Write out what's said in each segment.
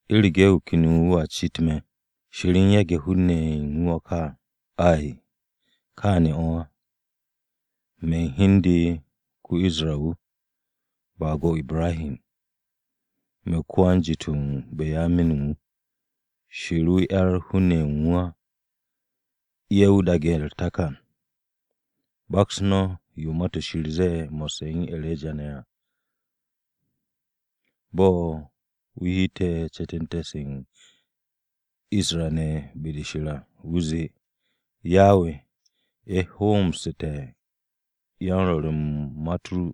U̱rege̱ wu̱ ken wu̱a cit me̱: ¿Shir u̱n yage̱ hun-ne̱ ye̱ u̱n wu̱ o̱ ka? Ay! Kaane̱ o̱ á, me̱ u̱n hi u̱n de ko-Isra-wu̱, baag-o Ibrahi, me̱ ko-wan-jit-o̱ Banyamin wu̱. Shir 'yar hun-ne̱ ye̱ u̱n wu̱ á, ye̱ wu̱ daage̱ u̱r-takan à. Baks no̱ yo Ma-to̱ Shir zee, mo̱sse̱ u̱n E̱reja ne̱ à, bo̱ wu̱ heete̱ ce̱te̱nte̱-se u̱n Isra-ne̱ be-de Shir à, wu̱ zee, “Yawe, ye̱ hoomsu̱te̱ yan-Rwo̱r u̱n Ma-u̱t ru.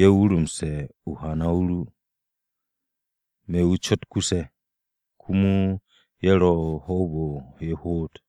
Ye̱ wurumse̱ hana-o ru. Me̱ wu̱ cot kuse̱, komo ye̱ ro̱ me̱ o-hoob ye̱ hoot.”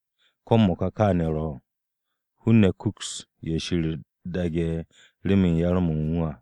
Ko̱ m-mo̱ka kaane̱ ro̱. Hun-ne̱ kuks ye̱ Shir daage̱ remen yar-mo̱ u̱n wu̱ à.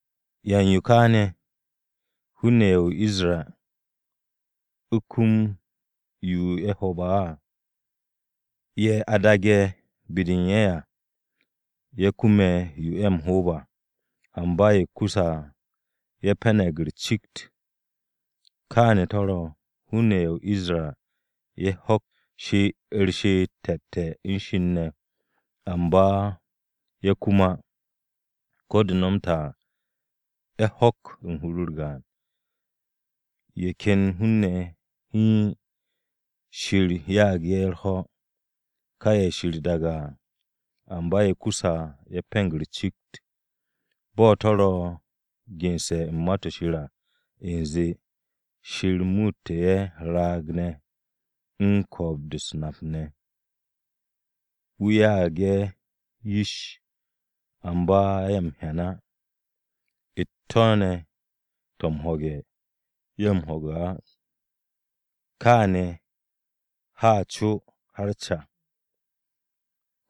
¿Yan yo ka ne̱? Hun-ne̱ ye̱ o-Isra u̱ kume̱ yo ye̱ o-hoob á. Ye̱ a daage̱ be-de u̱n ye̱ à, ye̱ kume̱ yo ye̱ ro o-hoob à. Amba ye̱ kuse̱ à, ye̱ pe̱ne̱g u̱r-cikt. Kaane̱ to̱ ro̱, hun-ne̱ ye̱ o-Isra ye̱ ho̱k u̱r-she'et te̱te̱ u̱n Shir ne̱. Amba ye̱ kum á, ko̱ de̱ nomte̱ à, ye̱ ho̱k u̱n hur-u̱r gaan. Ye̱ ken hun-ne̱ ye̱ hiin, Shir ya'ag ye̱ u̱r-ho̱, ka ye̱ Shir daage̱ à. Amba ye̱ kuse̱ à, ye̱ pe̱ne̱g u̱r-cikt. Bo̱ to̱ ro̱ gense̱ u̱n Ma-to̱ Shir à: U̱nze “Shir muute̱ ye̱ raag-ne̱ u̱n ko̱o̱b-de m-nap ne̱. Wu̱ ya'ag ye̱ yish amba ye̱ m-hyan á, u̱t-to̱ ne̱ to̱ m-ho̱ge̱, ye̱ m-ho̱ge̱ á, kaane̱ ha co har ca.”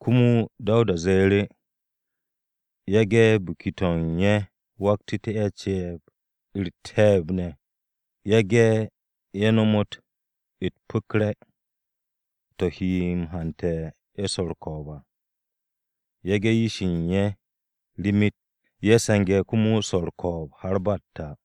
Komo Dawuda ze̱e̱ru̱, “Yage̱ biki-to̱ u̱n ye̱ waktu̱te̱ ye̱ ce̱e̱b, u̱r-te̱e̱b ne̱. Yage̱ ye̱ nomot u̱t-pu̱kre̱, to̱ he ye̱ m-hante̱ u̱n swo̱ u̱r-ko̱o̱b à. Yage̱ yish-ye̱ u̱n ye̱ rimit, ye̱ se̱nge̱ komo swo̱ u̱r-ko̱o̱b de̱e̱n ba m-ta.”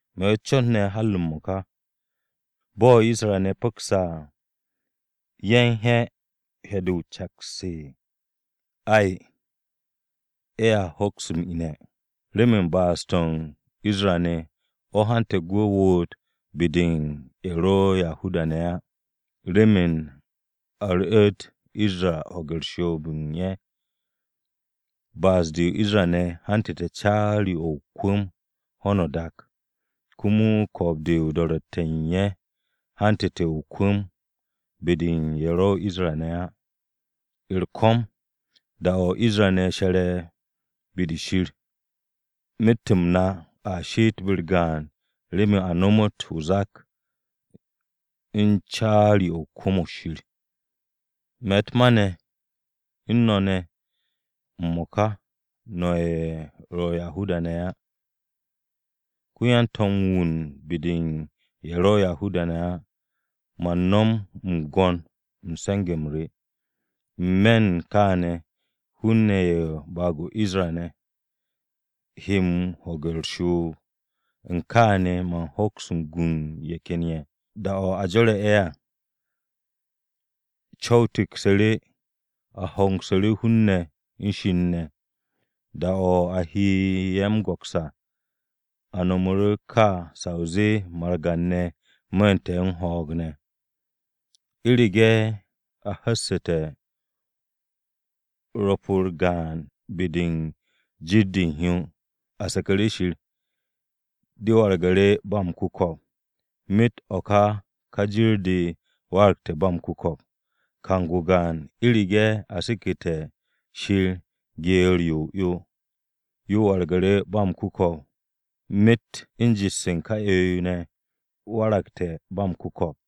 Me̱ o-cot ne̱ har m-mo̱ka. Bo̱ Isra-ne̱ pu̱kse̱ à, ¿ye̱ u̱n he̱ he̱-de o-caks? Ay! Ye̱a hoks m-ine̱. Remen ba'as-to̱ u̱n Isra-ne̱, o̱ hante̱ gwu̱ woot be-de u̱n ye̱ ro̱ Yahuda-ne̱ á, remen a ru̱'u̱t Isra-ne̱ ho̱ge̱ u̱n shoob-de u̱n ye̱. Ba'as-de u̱n Isra-ne̱ hantu̱te̱ caari-o̱ o-kwu̱m ho̱no o-dak. Komo ko̱o̱b-de o-do̱ro̱tte̱ de u̱n ye̱ hantu̱te̱ o-kwu̱m be-de u̱n ye̱ ro̱ Isra-ne̱ á. U̱r-ko̱m, da-o̱ Isra-ne̱ she̱re̱ be-de Shir, myet-m na a she'et be-u̱r gaan remen a nomot o-zak u̱n caari-o̱ kwu̱m-o̱ Shir. Me̱ u̱t-ma u̱n no̱ ne̱ m-mo̱ka no̱ ye̱ ro̱ Yahuda-ne̱ á. Ko̱ yan-to̱m wu̱ u̱n be-de ye̱ ro̱ Yahuda-ne̱ á, man no̱m m-gwo̱n u̱n se̱nge̱-m re. N-me̱ u̱n kaane̱, hun-ne̱ ye̱ u̱n baag-o re Isra-ne̱ he m-ho̱ge̱ u̱r-shoob, u̱n kaane̱ man hoks gu u̱n ye̱ ken ye̱. Da-o̱ a jo̱re̱ ye̱ à, co̱w-o tiksu̱ru̱ a hongsu̱ru̱ hun-ne̱ u̱n Shir ne̱. Da-o̱ a he ye̱ m-go̱ks à, a no̱m o̱ ka sa o zee margan-ne̱ mu̱u̱nte̱ u̱n ho̱o̱g ne̱! U̱rege̱ a hu̱ste̱ rwo̱p-u̱r gaan-de u̱n hyo be-de u̱n jir-de u̱n hyo, a seku̱ru̱ Shir, de waragu̱ru̱ ba m-ku̱ko̱p. Myet o̱ ka ka jir-de waragte̱ ba m-ku̱ko̱p. Kang-o gaan, u̱rege̱ a seke̱te̱ Shir geer-yo o-'yo, yo waragte̱ ba m-ku̱ko̱p. Myet u̱n jet-se u̱n ka 'yo-yo ne̱ waragte̱ ba m-ku̱ko̱p.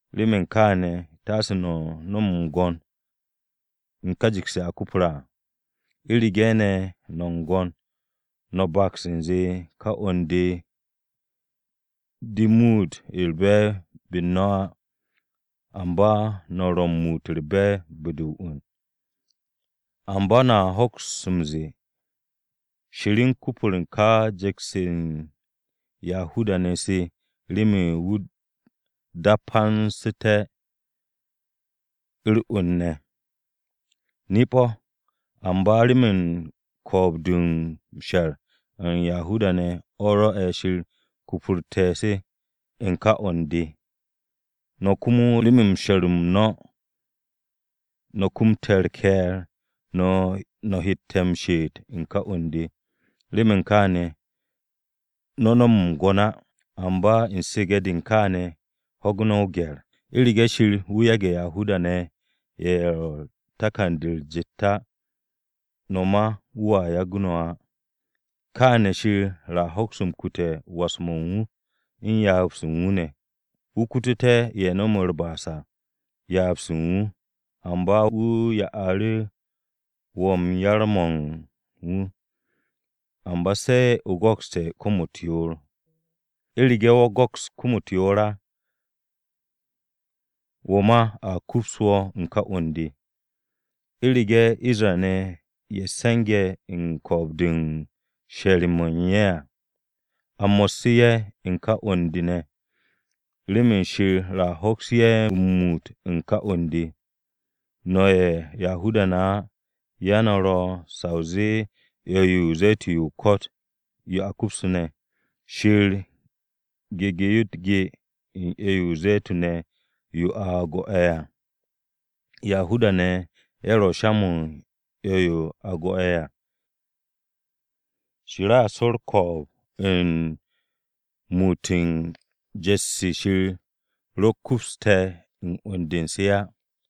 Remen kaane̱, taase no̱ no̱m m-gwo̱n u̱n ka jet-se a kupre̱ à. U̱rege̱ ne̱ no̱ m-gwo̱n, no̱ baks u̱nze, ka 'wu̱n-de de muut u̱r-be̱e̱b be-u̱r no̱ á, amba no̱ ro̱ muut u̱r-be̱e̱b be-de u̱r-'wu̱n. Amba no̱a hoks m-ze̱e̱, “Shir u̱n kupur ka jet-se se u̱n Yahuda-ne̱ se remen wu̱ dapansu̱tú̱ te̱ u̱r-'wu̱n ne̱.” Nip-o̱, amba remen ko̱o̱b-de m-she̱r u̱n Yahuda-ne̱ o̱ rwo̱'e̱ Shir kupurte̱ se u̱n ka 'wu̱n-de, no̱ komo remen m-she̱r o̱ no̱ kumte̱ u̱r-ke̱e̱r no̱ hette̱ m-she'et u̱n ka 'wu̱n-de. Remen kaane̱, no̱ no̱m m-gwo̱n á, amba u̱n su̱ge̱-de u̱n kaane̱ ho̱ge̱ o-gye̱r. U̱rege̱ Shir wu̱ yage̱ Yahuda-ne̱ ye̱ ro̱ takan-de u̱s-jet á, no̱ ma wu̱a yagu̱ no̱ á. Kaane̱ Shir a hoks m-kute̱ was-mo̱ u̱n wu̱, u̱n ryaab-se u̱n wu̱ ne̱. Wu̱ kutute̱ ye̱ no̱me̱ u̱r-ba'as à ryaab-se u̱n wu̱, amba wu̱ ya'u̱ru̱ wo̱ yar-mo̱ u̱n wu̱. Amba se̱ o go̱kste̱ kom-u̱t yoor. U̱rege̱ wo̱ go̱ks kom-u̱t yoor á, wo̱ ma a kups wo̱ u̱n ka 'wu̱n-de. U̱rege̱ Isra-ne̱ ye̱ se̱nge̱ u̱n ko̱o̱b-de m-she̱r mo̱ u̱n ye̱ á, a mo̱sse̱ ye̱ u̱n ka 'wu̱n-de ne̱, remen Shir a hoks ye̱ m-muut u̱n ka 'wu̱n-de. No̱ ye̱ Yahuda-ne̱ á, ya no̱ ro̱ sa o zee 'yo-yo o-ze̱tun yo o-ko̱t yo a kupsu̱ne̱, Shir gege̱ yo u̱t-ge u̱n 'yo-yo o-ze̱tun ne̱ yo a go̱'e̱ à. Yahuda-ne̱ ye̱ ro̱ sha-mo̱ u̱n 'yo-yo a go̱ ye̱ à, Shir a su̱ u̱r-ko̱o̱b u̱n muut u̱n jet-se Shir ro kupste̱ u̱n 'wu̱n-de u̱n se á.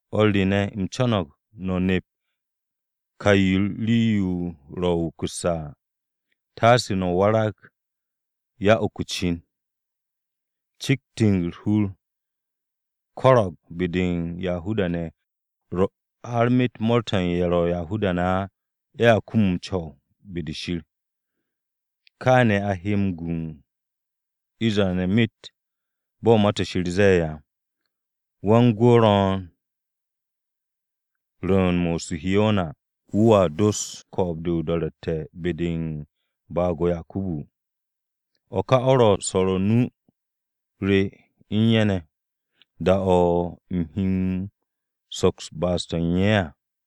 O̱r re ne̱, u̱m co̱no̱g no̱ nep ka ka rii-yo ro̱ wukusse̱ à. Taase no̱ warag yan-uku-cin. Cikt-de u̱r-hur ko̱ro̱g be-de u̱n Isra-ne̱ har myet mo̱o̱r-to̱ u̱n ye̱ ro̱ Yahuda-ne̱ á, ye̱a kum m-co̱w be-de Shir. Kaane̱ a he m-gu u̱n Isra-ne̱ myet. Bo̱ Ma-to̱ Shir ze̱e̱ à: “Wan-gwu̱ ro̱o̱n rwu̱u̱n-mo̱ o-Urusharima, wu̱ doste̱ ko̱o̱b-de o-do̱ro̱tte̱ be-de u̱n baag-o Yakubu. O̱ ka o̱ ro̱ swo̱r nu-o re u̱n ye̱ ne̱, da-o̱ u̱m he soks ba'as-de u̱n ye̱ à.”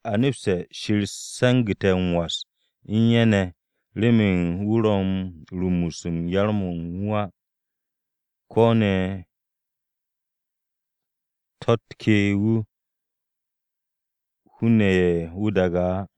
A nepste̱ Shir se̱ngu̱te̱ m-was u̱n ye̱ ne̱ remen wu̱ ro̱ u̱n rumus u̱n yar-mo̱ wu̱ á, ko̱ ne̱ to̱-u̱t ke wu̱ hun-ne̱ ye̱ wu̱ daage̱ à.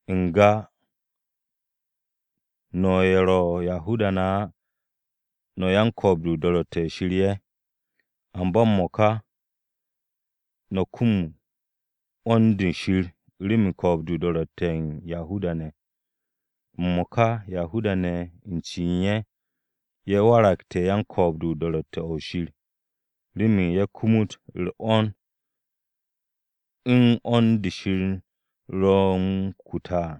N-ga no̱ ye̱ ro̱ Yahuda-ne̱ á, no̱ yan-ko̱o̱b-de o-do̱ro̱tte̱ o̱ Shir ye̱; amba m-mo̱ka, no̱ kumug 'wo̱n-de Shir remen ko̱o̱b-de o-do̱ro̱tte̱ o̱ u̱n Yahuda-ne̱. M-mo̱ka Yahuda-ne̱ u̱n cen ye̱, ye̱ waragte̱ yan-ko̱o̱b-de o-do̱ro̱tte̱ o̱ Shir, remen ye̱ kumut u̱r-'wo̱n u̱n 'wo̱n-de Shir ro̱ no̱ m-kute̱ à.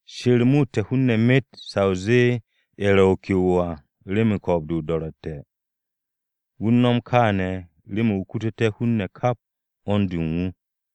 Shir muute̱ hun-ne̱ myet sa o zee ye̱ ro̱ ke'o à remen ko̱o̱b-de o-do̱ro̱tte̱. Wu̱ u̱n no̱m kaane̱ remen wu̱ kututé̱ hun-ne̱ kap 'wo̱n-de u̱n wu̱.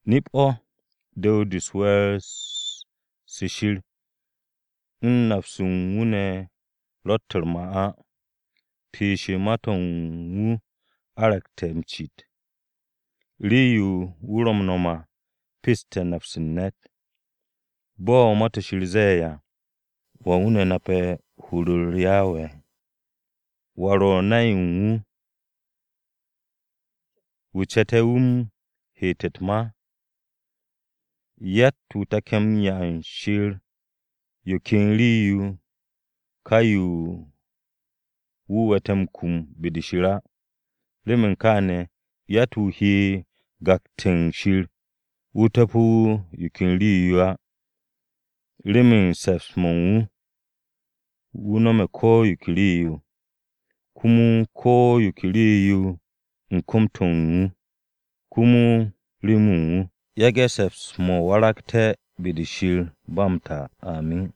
Nip-o̱ du̱w-de u̱n we̱e̱r-se Shir u̱n nap-se u̱n wu̱ ne̱ ro̱tt u̱r-ma á, piish u̱t-ma to̱ u̱n wu̱ argu̱te̱ m-cit. Rii-yo wu̱ ro̱ m-nom à peste̱ nap-se u̱n ne̱t. Bo̱ Ma-to̱ Shir ze̱e̱ à: “¿Wan wu̱ nape̱ hur-u̱r Yawe? ¿Wa ro̱ nay u̱n wu̱, wu̱ ce̱te̱ wu̱ m-heete̱ u̱t-ma?” “Yatt-wu̱ take̱ m-'ya u̱n Shir yo ken rii-yo ka yo wu̱ we̱tte̱ m-kum be-de Shir á. Remen kaane̱, yatt-wu̱ he m-gakte̱ u̱n Shir wu̱ topo̱té̱ wu̱ yo ken rii-yo á.” Remen se̱ps-mo̱ u̱n wu̱, wu̱ no̱me̱ ko̱ yo ke rii-yo. Komo ko̱ yo ke rii-yo ro̱ u̱n kom-to̱ u̱n wu̱, komo remen wu̱. Yage̱ se̱ps-mo̱ waragte̱ be-de Shir ba m-ta, amin.